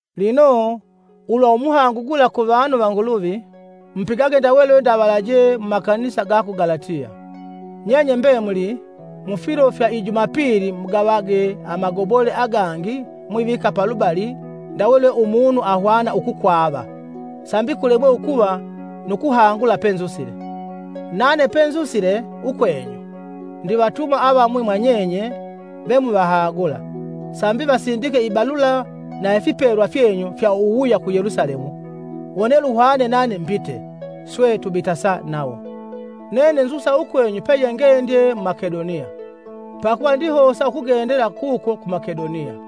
Lino, ulwa umuhangu gula kuvanu va Nguluvi: mupigage ndawe lwe ndavalaje mu makanisa ga ku Galatiya. Nyenye mbemuli, mufilo fya i Jumapili mugavage amagobole agangi mwivika palubali ndawe lwe umunu ahwana ukukwava, sambi kulemwe ukuva nu kuhangula penzusile. Nane pe nzusile ukwenyu, ndivatuma avamwi mwanyenye vemuvahagula, sambi vasindike ibalula na ifipelwa fyenyu fya uwuwuya ku Yelusalemu. Wone luhwane nane mbite, swe, tubitasa nawo. Nene nzusa ukwenyu peyengendye mu Makedoniya, pakuva ndihosa ukugendela kuko ku Makedoniya.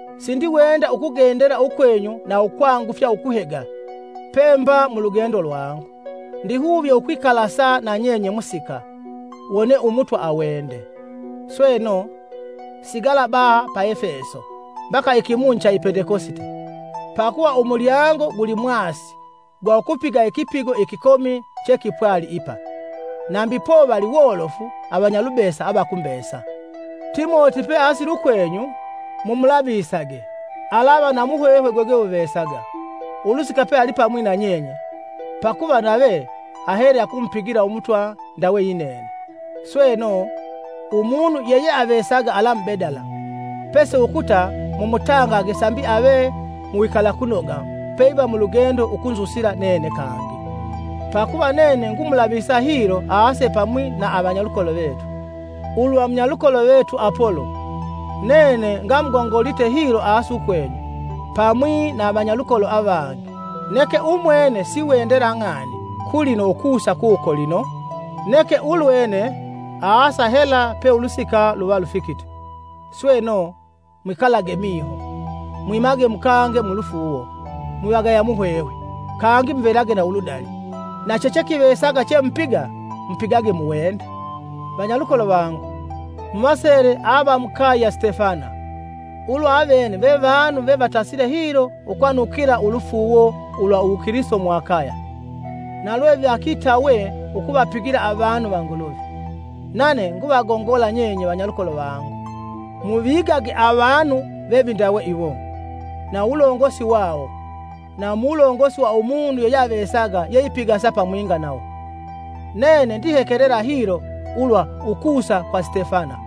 Sindiwenda ukugendela ukwenyu na ukwangufya ukuhega pemba mulugendo lwangu. Ndihuvye ukwikalasa nanyenye musika, wone Umutwa awende. Sweno, sigala baha pa Efeso mbaka ikimunyi cha i Pendekosite. Pakuva umulyango gulimwasi gwa ukupiga ikipigo ikikomi chekipwali ipa, nambi povali wolofu avanyalubesa avakumbesa. Timoti peasile ukwenyu, mumulavisage, alava na muhwehwe gwegweguvesaga ulusika pe alipamwi na nyenye, pakuva nave ahele akumupigila Umutwa ndawe yinene. Sweno, umunu yeyeavesaga alamubedala, pesi ukuta mumutangage sambi ave mu wikalakunoga peiva mulugendo ukunzusila nene kangi, pakuva nene ngumulavisa hilo aase pamwi na avanyalukolo vetu. Ulwa munyalukolo vetu Apolo, nene ngamugongolite hilo aase ukwenyu, pamwi na avanyalukolo avangi, neke umwene siwendela ng'ani kulino ukusa kuko lino, neke ulwene aasa hela pe ulusika luva lufikite. Sweno, mwikalage miho, mwimage mukange mu lufuuwo, mwivagaya muhwehwe, kangi muvelage na uludali. Na chechekivesaga chemupiga, mupigage mu wende. Vanyalukolo vangu, muvaseele ava mukaye ya Sitefana; ulwa avene ve vanu vevatasile hilo ukwanukila ulufuuwo ulwa uwukilisito mu Akaya, na lwe vakitawe ukuvapigila avanu va Nguluvi. Nane nguvagongola nyenye vanyalukolo vangu, muvigage avanu vevindawe iwo na uwulongosi wawo na mu wulongosi wa umunu yeyeavesaga yeipigasa pamwinga nawo. Nene ndihekelela hilo ulwa ukusa kwa Sitefana,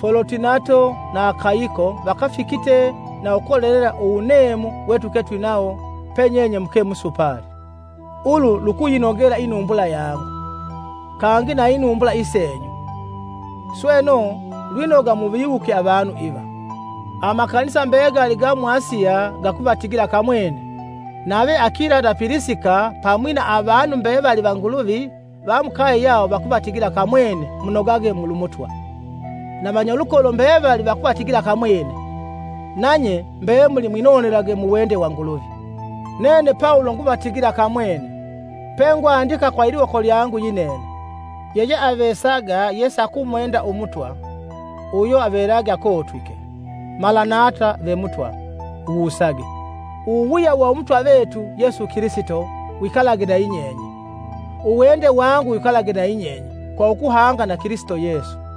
Folotinato na Akayiko vakafikite na ukolelela uwuneemu we tuke twinawo pe nyenye muke musupali. Ulu lukuyinogela inumbula yangu, kangi na inumbula isenyu. Sweno, lwinoga muviwuke avanu iva. Amakanisa mbegali ga mu Asiya gakuvatigila kamwene. Nave Akila na Pilisika pamwi na avanu mbevali va Nguluvi va mukaye yawo vakuvatigila kamwene munogage mulu Mutwa. Na vanyalukolo mbevali vakuvatigila kamwene. Nanye mbemuli mwinonelage mu wende wa Nguluvi. Nene Pawulo nguvatigila kamwene, pengwandika kwa iliwoko lyangu yinene. Yeyeavesaga yesakumwenda Umutwa, uyo avelage akotwike. Malanata-ve Mutwa, wusage! Uwuwuya wa Umutwa vetu Yesu Kilisito, wikalage na yinyenye. Uwende wangu wikalage na yinyenye kwa ukuhanga na Kilisito Yesu.